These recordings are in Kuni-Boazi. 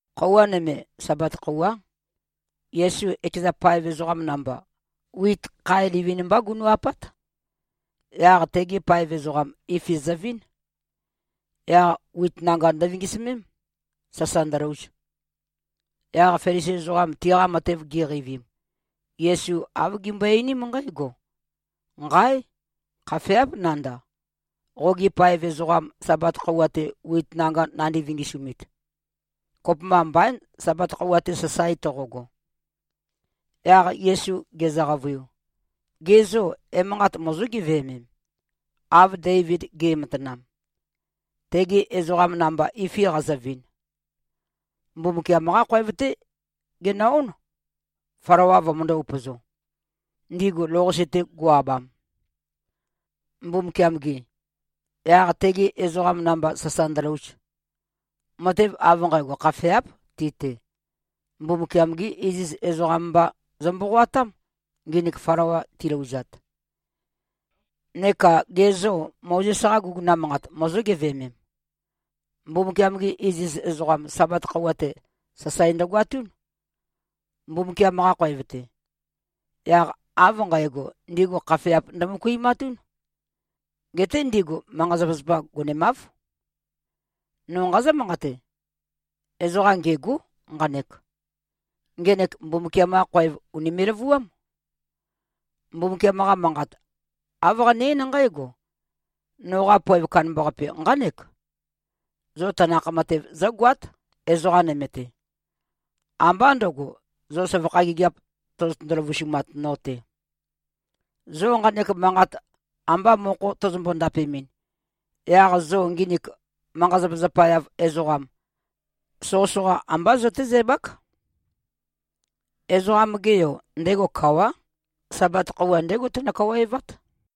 Khøuwa nøme, Sabat khøuwá, Yesu ekeza paev ezoqam namba, wit khae livin-mbá gunu꞉-apát. Yaq tegi paev ezoqam, ifi zøvín. Yaq wit nanga ndøvingisømém, sasa ndølouz. Yaq Felisi ezoqam tiqa matev giqeivim, Yesu āv gimbøe-einím nqǽgo, “Nqáe! Khafeáp nandav, qogi paev ezoqam Sabat khøuwa-te wit nanga nandi-vingisumit. Kopømba mbaín, Sabat khøuwa-te, sasae toqogo.” Yaq Yesu gezø-qavøiu, “Ge zô, emanqat mozó-geveømem, av Deivid ge꞉matanam, tegi ezoqam namba ifi qazøvin? Mbumbukiam-qá khoev-té genø-ón, flawa vømøndō-upøzo, ndigu lou-qase-te go꞉-abam, Mbumbukiam-gi, yaq tegi ezoqam namba sasa ndølouz. Matev av nqægo khafeáp ti-te. Mbumbukiam-gí iziz ezoqam mba zø-mboqoatám, nginik flawa tilouzat. Neka ge zô, Mozes-qa guguna manqat mozó-geveømem? Mbumbukiam-gi iziz ezoqam, Sabat khøuwa-te, sasae ndøgoatún, Mbumbukiam-qa khoev-te. Yaq av nqægo ndigu khafeap ndømøkuimatún. Geté ndigu manqa-zapazapa gonemáv. No nqazǿ-manqate: Ezoqa ngêgó nqanek. Ngenek Mbumbukiam-qa khoev ùnime꞉-løvuám. Mbumbukiam-qa Manqat āv qane-eín nqǽgo, ‘Noqa poev kandambaqape nqánek: Zo tanakh matev zǿgoát, ezoqa nøme-te. Ambá ndǿgo, zo søvakha gigiap tozotøndo-løvusumat no-te.’ Zo nqanek manqat ambā mokho tozombo-ndapemɨn, yaq zo nginik manqa-zapazapa-yav ezoqam, soqøsoqa ambá zøtézæbák. Ezoqam-ge Yo, ndego kawá. Sabat khøuwa, ndégo teno-kawaevát.”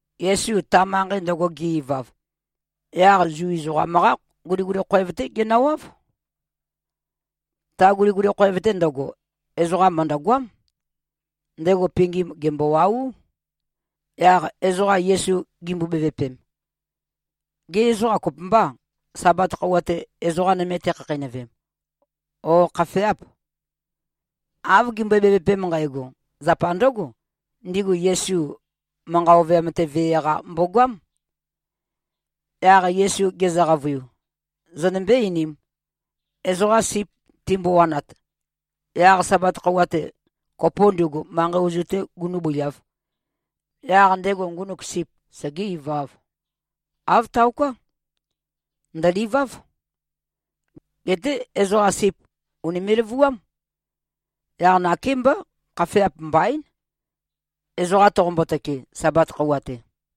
Yesu ta manqei ndøgo ge-ivav, yaq Zu ezoqam-qá guliguli khoev-té genøwáv. Ta guliguli khoev-te ndøgo, ezoqam mø̀ndøgoám. Ndego pingim gèmbowaú. Yaq ezoqa Yesu gimbo-bevøpem, “Gê, ezoqa kopømbâ, Sabat khøuwa-te, ezoqa nøme tekhakheinøvem, ó, khafeâp?” Av gimbøe-bevøpem nqægo, zapa ndǿgo: Ndigu Yesu manqa ovøyam-te vee-qa mbogoám. Yaq Yesu gezø-qavøiu, “Zonømbé-einīm. Ezoqa sip timbowanat, yaq Sabat khøuwa-te, kopo ndugu manqei ozu-tē gunūbøiāv, yaq ndego ngunuk sip segé-ivāv? Āv taoká. Ndø̀liváv. Geté ezoqam sip ùnime꞉-løvuám. Yaq nakémbá, khafeap mbaín, ezoqam toqombo-tøke, Sabat khøuwa-te.”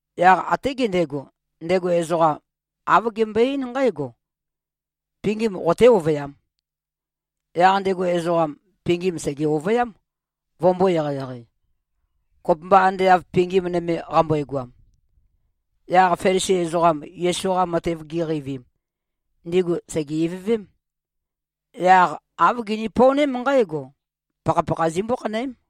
Yaq até gendego, ndego ezoqam āv gembøe-eín nqǽgo, “Pingim qoté-ovøyām.” Yaq ndego ezoqam, pingim sège-ovøyám, vømbō-eqeieqei, kopømba ande av pingim nøme qambøegoam. Yaq Felisi ezoqam Yesu-qa matev giqeivim, ndigu sège-ivøvém. Yaq āv gini-pøoném nqǽgo: Pakhapakha zimbó-khanøém.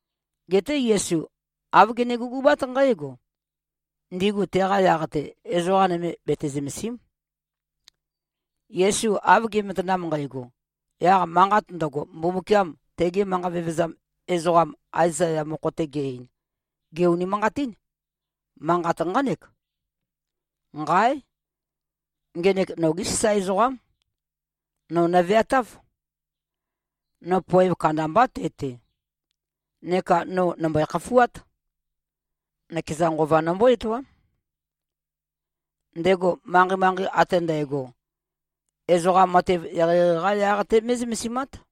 Geté Yesu āv gene-gugubát nqǽgo: Ndigu teqa yaq-te, ezoqa nøme bete-zømèsi᷄m. Yesu av ge꞉matanam nqægo, yaq manqat ndøgo, Mbumbukiam tege manqa vevezam ezoqam Aezaya mokho-te ge-ein, gè-unimanqatín. Manqat nqánek, “Nqáe! Ngenek nogé sasae ezoqám. Nō nøveatáv. No poev kandambá te-te, neka no nø̀mbøe-khafuát. Nøkeza Nqova nombó-etoám. Ndego manqei-manqei ate ndægo, ezoqa matev eqeieqei-qá yaq-té mé꞉zømesimát.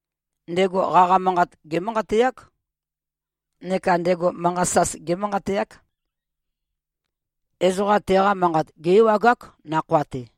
Ndego qaqa manqat gémanqateák. Neka ndego manqa sas gémanqateák. Ezoqa teqa manqat gé-ewagák, nakhoa-te.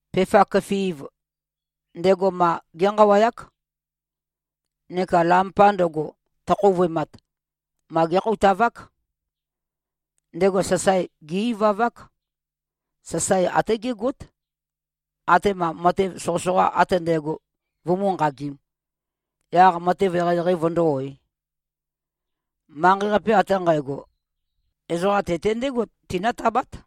Pefa køfi꞉v, ndego ma génqawayák. Neka lampa ndøgo, tøkhouvøemat, ma gékhoutavák. Ndego sasae gé-ivavák. Sasae até gégót, atema matev soqøsoqa ate ndægo vumú-nqagīm, yaq matev eqeieqei vøndó-oē. Manqei-qape ate nqægo, ezoqa te-te ndégo tinǿtabát.”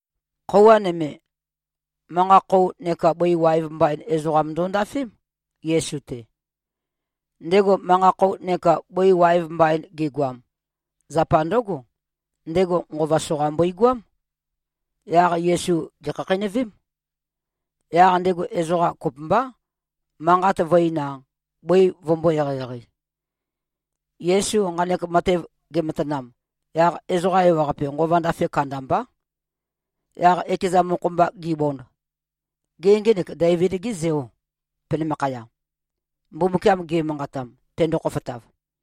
Khøuwa nøme, manqa-khou neka bøi waev mbain ezoqam ndondafém, Yesu-te. Ndego manqa-khou neka bøi waev mbain gegoam, zapa ndǿgo: Ndego nqova soqa mbøigoám. Yaq Yesu gèkhakheinøvém. Yaq ndego ezoqam kopømbá, manqat vø̄-ein-a, bøi vømbō-eqeieqei. Yesu nqanek matev gematanam, yaq ezoqa ewaqape nqova ndafe kandambá. Yaq ekeza mokho-mba gibond, “Gê, ngenek Deivid-gê Zeò penømakhaya, Mbumbukiam ge꞉manqatam, tendo-khofotav?”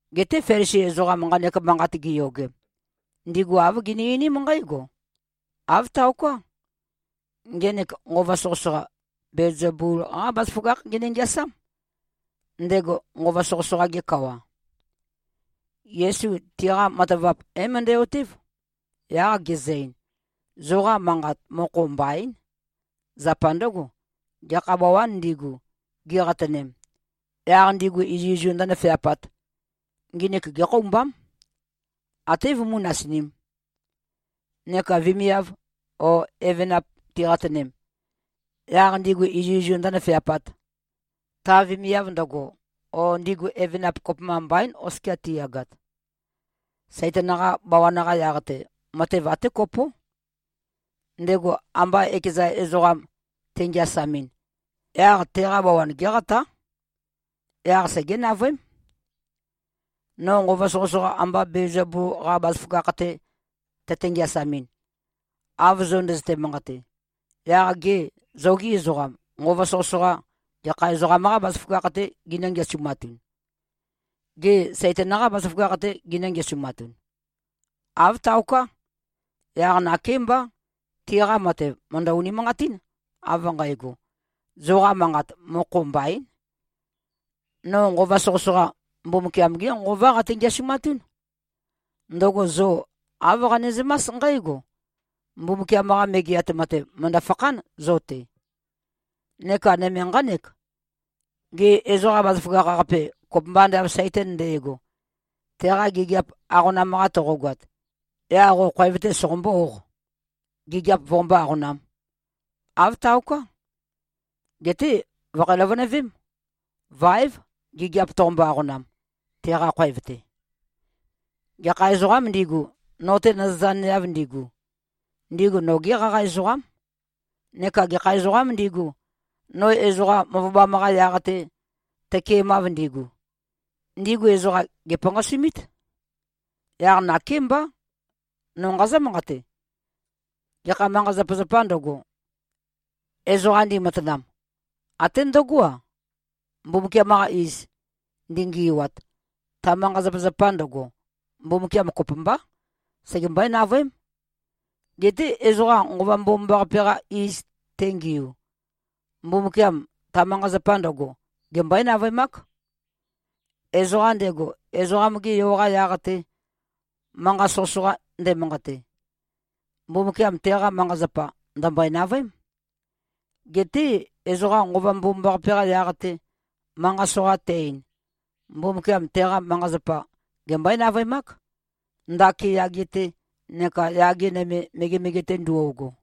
Geté Felisi ezoqam nqanek manqat giyogem, ndigu āv gini-einím nqǽgo, “Āv taoká. Ngenek nqova soqøsoqa, Belzebul-qá bazaføgákh gene-ngeasám, ndego nqova soqøsoqa-ge kawa.” Yesu tiqa matavap é-møndæ-otév, yaq gezø-ein, “Zoqa manqat mokho mbaín. Zapa ndǿgo, gekha bawān ndigu, giqatønem, yaq ndigu izuizu ndǿnøfeapāt, nginik gékhoumbám, até vømú-nasinīm. Neka vemiav o evenap tiqatønem, yaq ndigu izuizu ndǿnøfeapāt, ta vemiav ndøgo o ndigu evenap, kopømba mbaín, oskia tiyagat. Saitan-qa bawan-qa yaq-te, matev até kopó. Ndego amba ekeza ezoqa tengeasamɨn, yaq teqa bawan géqatá. Yaq segé-navøém. No nqova soqøsoqa amba Belzebul-qa bazaføgakh-te tøte-ngeasamɨn, av zo ndøzøte-manqate, yaq gê, zogī ezoqam, nqova soqøsoqa gekha ezoqam-qâ bazaføgakh-tē ginǿ-ngeasumatun? Gê, Saitan-qâ bazaføgakh-tē ginǿ-ngeasumatun? Āv taoká. Yaq nakémbá. Tiqa matev mø̀ndø-unimanqatín, av nqægo, zoqa manqat mokho mbaín. No nqova soqøsoqa, Mbumbukiam-gé Nqová qate-ngeasumatún. Ndøgo zo āv qanezømás nqǽgo: Mbumbukiam-qa Megeat Matev, mø̀ndø-fakhán zo-te. Neka nøme nqánek: Gê, ezoqa bazaføgakh-qape, kopømba ande av Saitan nde꞉go, teqa gigiap aqonam-qa toqogoat, yaq qo khoev-tē soqombó-ōq, gigiap voqombó-aqonām? Āv taoká. Geté vø̀kho-løvønøvém. Váev, gigiap toqombo-aqonam, teqa khoev-te. Gekha ezoqām ndigu, no-te nøzøzaneav ndigu, ndigu nogí qaqa ezoqám. Neka gekha ezoqām ndigu, no ezoqa møvøbam-qa yaq-te tøkemav ndigu, ndigu ezoqa gèpanqasumít. Yaq nakémbá, no nqazǿ-manqate: Gekha manqa-zapazapā ndøgo, ezoqa ndimatanam, até ndøgó-a, Mbumbukiam-qa iz ndingi꞉wat, ta manqa-zapazapa ndøgo, Mbumbukiam kopømbá, segembøé-navøém. Geté ezoqa Nqova Mbomambaqape-qa iz tengiu, Mbumbukiam ta manqa-zapa ndøgo gembøé-navøemák. Ezoqam ndego, Ezoqam-ge Yo-qa yaq-te, manqa soqøsoqa ndemanqate, Mbumbukiam teqa manqa-zapa ndø̀mbøe-navøém. Geté ezoqa Nqova Mbomambaqape-qa yaq-te, manqa soqa te-ein, Mbumbukiam teqa manqa-zapa gembøé-navøemák, ndaki yage-te neka yage nøme, megemege-te ndo꞉go.”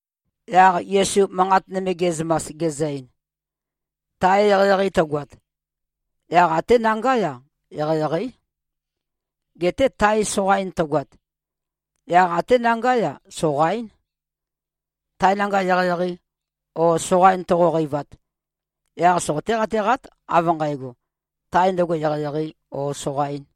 Yaq Yesu manqat nøme ge꞉zømas, gezø-ein, “Tae eqeieqei tøgoat, yaq até nangá-ya, eqeieqeí. Geté tae soqain tøgoat, yaq até nangá-ya, soqaín. Tae nanga eqeieqei o soqain toqoqeivat, yaq soqoté-qateqát, av nqægo, tae ndøgo eqeieqeī o soqaīn.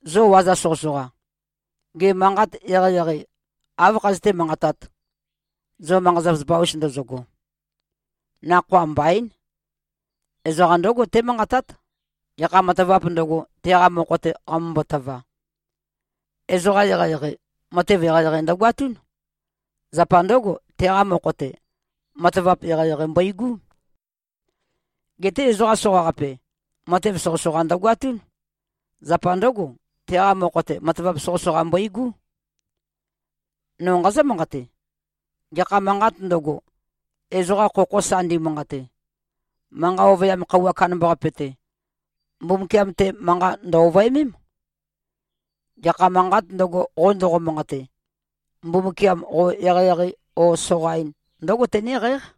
Zo waza soqøsoqa. Gê, manqat eqeieqei áv khazøté-manqatāt, zo manqa-zapazapa-us ndozogo? Nakhoa mbaín. Ezoqa ndǿgo témanqatát, gekha matavāp ndøgo, teqa mokho-te qamømbo-tøva. Ezoqa eqeieqei, matev eqeieqei ndøgoatún. Zapa ndǿgo, teqa mokho-te, matavap eqeieqei mbøigú. Geté ezoqa soqaqape, matev soqøsoqa ndøgoatún. Zapa ndǿgo, teqa mokho-te, matavap soqøsoqa mbøigú. No nqazǿ-manqate: Gekha manqāt ndøgo, ezoqa khokho sa ndimanqate, Manqa ovøyam khøuwa kandambaqape-te, Mbumbukiam-te manqa ndø̀-ovøemém. Gekha manqāt ndøgo, qo ndoqo-manqate, Mbumbukiam qo eqeieqei o soqain ndǿgo tenéqǽq.”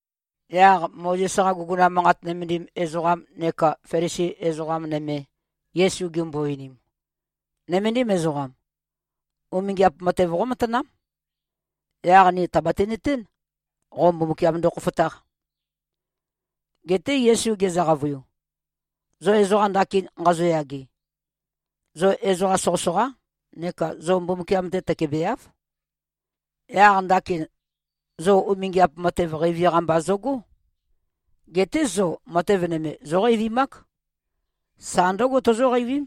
Yaq Mozes-qa guguna manqat nømendim ezoqam neka Felisi ezoqa nøme, Yesu gimbo-einim, “Nøméndim ezoqam. Umingiap matev qómatanám. Yaq ni tàbati-nøtén, qo Mbumbukiam ndokhofotāq.” Geté Yesu gezø-qavøiu, “Zo ezoqa ndakin nqazoyage, zo ezoqa soqøsoqá neka zo Mbumbukiam-te tøkebeáv. Yaq ndakin, zo umingiap matev qeivi-qa mba zøgó. Geté zo matev nøme zóqeivimák. Sa ndǿgo tozóqeivím,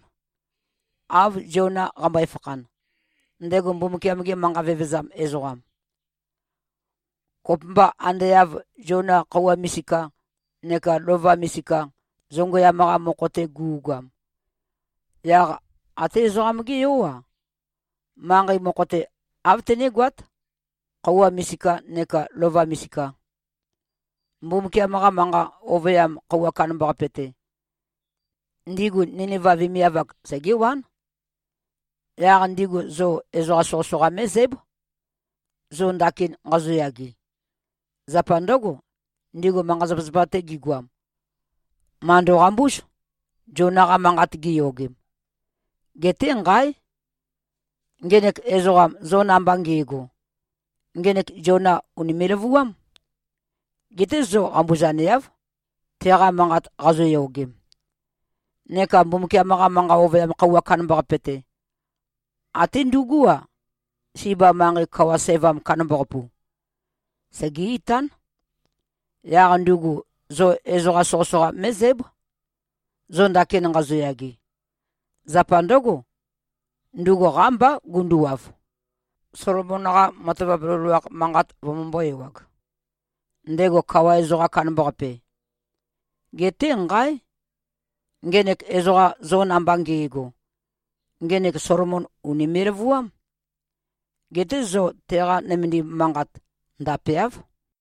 av Ziona qambøe-fakhan, ndego Mbumbukiam-ge manqa vevezam ezoqam. Kopømba ande av Ziona khøuwa misika neka lova misika zongøyam-qa mokho-te gu꞉goam, yaq até Ezoqam-gé Yó-a, manqei mokho-te āv tenégoát, khøuwa misikā neka lova misika. Mbumbukiam-qa Manqa Ovøyam Khøuwa Kandambaqape-te, ndigu Niniva vemiav-ak, segéwán. Yaq ndigu zo ezoqa soqøsoqa mé꞉zǽb, zo ndakin nqazoyage. Zapa ndǿgo, ndigu manqa-zapazapa-te gigoam, màndo-qambúz, Ziona-qa manqat gi꞉yogem. Geté, nqáe! Ngenek ezoqam zo namba nge꞉go, ngenek Ziona ùnime꞉-løvuám. Geté zo qambuzaneáv, teqa manqat qazoyogem. Neka Mbumbukiam-qa Manqa Ovøyam Khøuwa Kandambaqape-te, até ndugú-a, Siba manqei kawa sævam kandambaqapu, segé-itán. Yaq ndugu zo ezoqa soqøsoqa mé꞉zǽb, zo ndakin nqazoyage. Zapa ndǿgo, ndugu qámbá gunduwav, Solomon-qa matavap loloakh manqat vømømbō-ewag, ndego kawa ezoqam kandambaqape. Geté, nqáe! Ngenek ezoqam zo namba nge꞉go, ngenek Solomon ùnime꞉-løvuám. Geté zo teqa nømendim manqat ndapeáv.”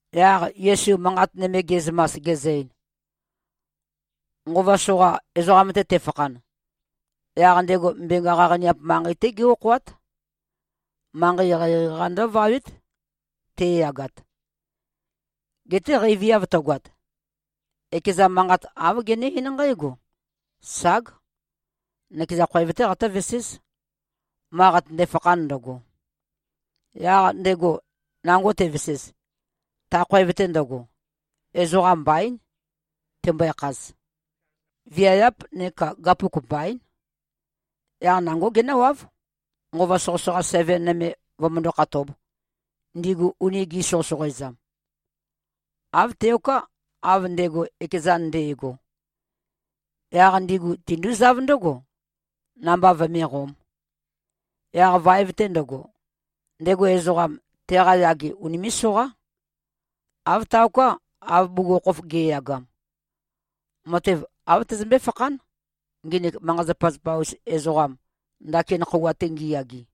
Yaq Yesu manqat nøme ge꞉zømas, gezø-ein, “Nqova soqa ezoqam-te tefakhan, yaq ndego mbenga qaqaniap manqei-té gé-okhoát. Manqei eqeieqei-qa ndǿvawét, te꞉yagat. Geté qeiviav tøgoat, ekeza manqat āv gené-eín nqǽgo, ‘Ság. Nøkeza khoev-té qatǿveséz, ma qatønde-fakhan ndøgo.’ Yaq ndego nango tevesez, ta khoev-te ndøgo, ezoqam mbaín, tembøe-khaz, viayáp neka gapuk mbaín. Yaq nangó genǿwáv, nqova soqøsoqa seven nøme vømøndó-khatōb, ndigu uni gi꞉soqøsoqoezam. Āv teoká, av ndego ekezan nde꞉go. Yaq ndigu tindúzáv ndǿgo, namba vøméqōm. Yaq vaev-te ndøgo, ndego ezoqam, teqa yage unimé꞉-soqá. Āv taoká, av bugukhokhof ge꞉yagam. Matev āv tøzømbé-fakhán, nginik manqa-zapazapa-us ezoqam, ndakin khøuwa-te ngiyage.”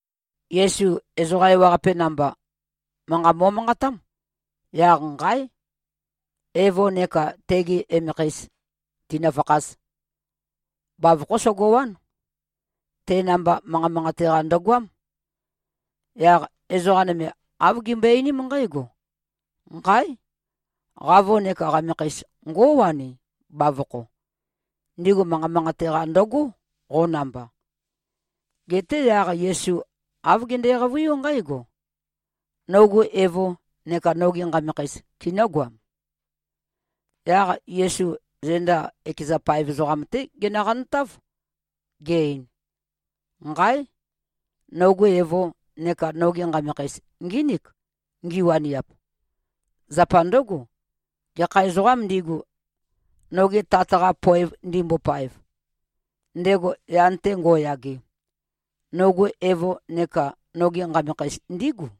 Yesu ezoqa ewaqape namba, manqa mo꞉manqatám, yaq nqáe! Evo neka tegi emekheis tīnø̄fākhāz. Bavokhó sogowán. Te namba manqa manqate-qa ndøgoám. Yaq ezoqa nøme āv gimbøe-einím nqǽgo, “Nqáe! Qavo neka qamekheis, ngówani, bavokho. Ndigu manqa manqate-qa ndøgó, qo namba.” Geté yaq Yesu āv gende-qavøiú nqǽgo, “Nogu evo neka nogi nqamekheis kinǿgoam?” Yaq Yesu zenda ekeza paev ezoqam-té genøqantáv, ge-ein, “Nqáe! Nogu evo neka nogi nqamekheis, ngínik, ngiwaniap. Zapa ndǿgo, gekha ezoqām ndigu, noge Tat-qa poev ndimbopaev, ndego yan-te ngo꞉yage, nogu evo neka nogi nqamekheis ndígu.”